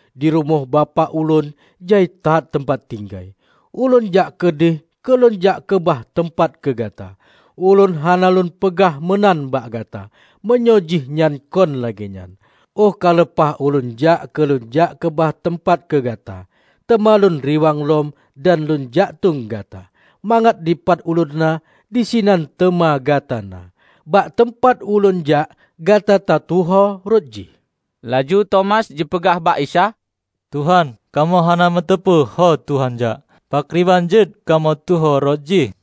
Di rumoh Bapak Ulôn jai that teumpat tinggai, Ulôn jak keudeh keu Lôn jak keubah teumpat keu gata. Ulôn hana Lôn peugah meunan bak gata, meunyoe jih nyan kon lagée nyan. Óh ka leupah Ulôn jak keu Lôn jak keubah teumpat keu gata, teuma Lôn riwang lom dan Lôn jaktueng gata, mangat dipat Ulôn na, disinan teuma gata na. Bak teumpat Ulôn jak gata tatuho rot jih." Laju Tomas jipeugah bak Isa, "Tuhan, kamoe hana meuteupeue ho Tuhan jak, pakriban jeuet kamoe tuho rot jih?"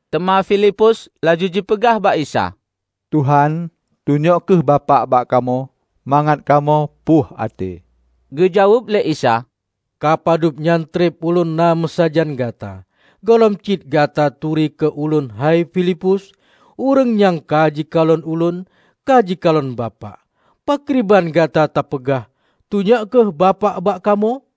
Teuma Filipus laju jipeugah bak Isa, "Tuhan, tunyok kheueh Bapak bak kamoe, mangat kamoe puih até." Geujaweueb lé Isa, "Ka padubnyan treb Ulôn na meusajan gata, gohlom cit gata turi keu Ulôn hai Filipus? Ureuëng nyang ka jikalon Ulôn, ka jikalon Bapak. Pakriban gata tapeugah, 'Tunyok kheueh Bapak bak kamoe'?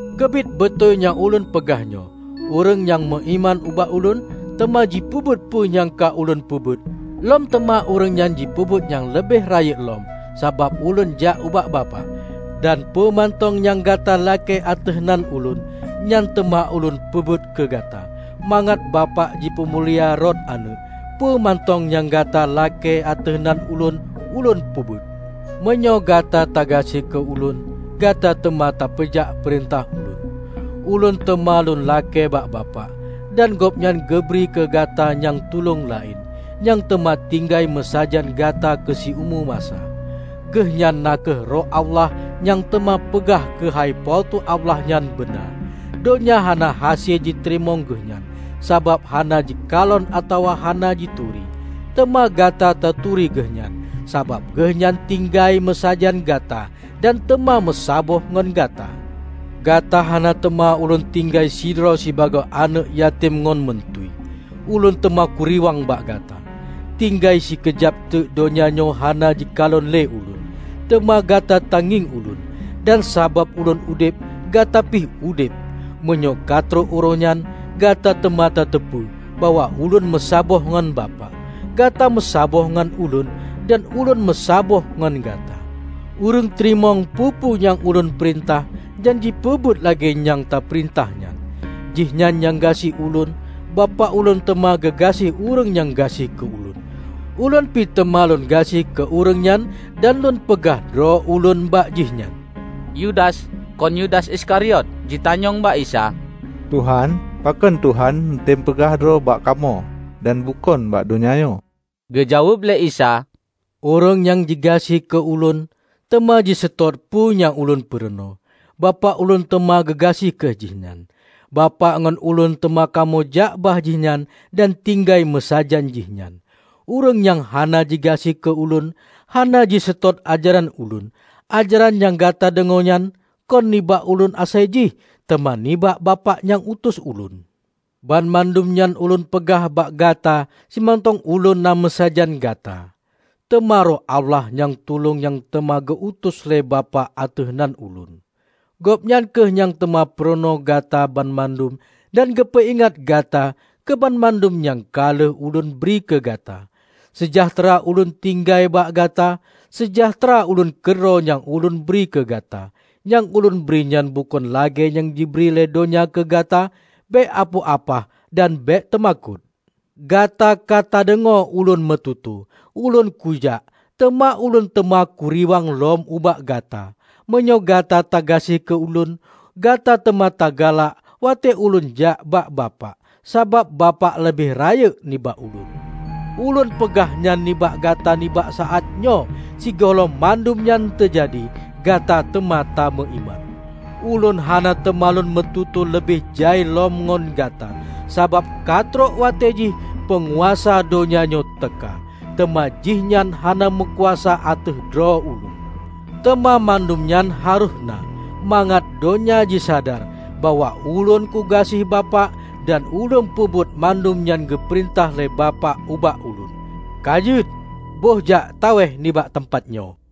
Keubiet beutôi nyang ulôn peugah nyoe: Ureuëng nyang meuiman ubak Ulôn, teuma jipeubuet peue nyang ka Ulôn peubuet -- lom teuma ureuëng nyan jipeubuet nyang leubeh rayeuk lom -- sabab Ulôn jak ubak Bapak. Dan peue mantong nyang gata lakée ateueh nan Ulôn, nyan teuma Ulôn peubuet keu gata, mangat Bapak jipeumulia rot Aneuëk. Peue mantong nyang gata lakée ateueh nan Ulôn, Ulôn peubuet." "Meunyoe gata tagaséh keu Ulôn, gata teuma tapeujak peurintah Ulôn. Ulôn teuma Lôn lakée bak Bapak, dan Gobnyan geubri keu gata nyang Tulông laén, nyang teuma tinggai meusajan gata keu siumu masa. Geuhnyan na kheueh Roh Allah nyang teuma peugah keuhai Po teu Allah nyan beuna. Donya hana hase jiteurimong Geuhnyan, sabab hana jikalon atawa hana jituri. Teuma gata taturi Geuhnyan, sabab Geuhnyan tinggai meusajan gata dan teuma meusaboh ngon gata. Gata hana teuma Ulôn tinggai sidroe sibagoe aneuëk yatem ngon meuntui. Ulôn teuma kuriwang bak gata. Tinggai sikeujab teuk donya nyoe hana jikalon le Ulôn. Teuma gata tangieng Ulôn. Dan sabab Ulôn udeb, gata pih udeb. Meunyoe katrok uroenyan, gata teuma tateupeue bahwa Ulôn meusaboh ngan Bapak, gata meusaboh ngon Ulôn, dan Ulôn meusaboh ngon gata. Ureuëng teurimong peue-peue nyang Ulôn peurintah dan jipeubuet lagée nyang teupeurintah nyan, jihnyan nyang gaséh Ulôn. Bapak Ulôn teuma geugaséh ureuëng nyang gaséh keu Ulôn. Ulôn pi teuma Lôn gaséh keu ureuëng nyan dan Lôn peugah droe Ulôn bak jihnyan." Yudas, (kon Yudas Iskariot) jitanyong bak Isa, "Tuhan, pakon Tuhan neutem peugah droe ubak kamoe dan bukon bak donya nyoe?" Geujaweueb lé Isa, "Ureuëng nyang jigaséh keu Ulôn, teuma jiseutôt peue nyang Ulôn purunoe. Bapak Ulôn teuma geugaséh keu jihnyan. Bapak ngon Ulôn teuma kamoe jak bak jihnyan dan tinggai meusajan jihnyan. Ureuëng nyang hana jigaséh keu Ulôn, hana jiseutôt ajaran Ulôn. Ajaran nyang gata deungoe nyan, kon nibak Ulôn asai jih, teuma nibak Bapak nyang utus Ulôn. Banmandum nyan Ulôn peugah bak gata simantong Ulôn na meusajan gata. Teuma Roh Allah, nyang tulông nyang teuma geu-utus lé Bapak ateueh nan Ulôn, Gobnyan kheueh nyang teuma peurunoe gata banmandum dan geupeuingat gata keu banmandum nyang ka lheueh Ulôn bri keu gata. Seujahteura Ulôn tinggai bak gata. Seujahteura Ulôn keudroe nyang Ulôn bri keu gata, nyang Ulôn bri nyan bukon lagée nyang jibri lé donya keu gata. Bék apoh apah dan bék teumakot. Gata ka tadeungoe Ulôn meututoe, 'Ulôn kujak, teuma Ulôn teuma kuriwang lom ubak gata'. Meunyoe gata tagaséh keu Ulôn, gata teuma tagalak watée Ulôn jak bak Bapak, sabab Bapak leubeh rayeuk nibak Ulôn. Ulôn peugah nyan nibak gata nibak saát nyoe, sigohlom mandum nyan teujadi, gata teuma tameuiman. Ulôn hana teuma Lôn meututoe leubeh jai lom ngon gata, sabab ka trok watée jih peunguasa donya nyoe teuka. Teuma jihnyan hana meukuasa ateueh droe Ulôn. Teuma mandum nyan harôh na mangat donya jisadar bahwa Ulôn kugaséh Bapak dan Ulôn peubuet mandum nyang geupeurintah lé Bapak ubak Ulôn. Ka jeuet, bohjak tawéh nibak teumpat nyoe."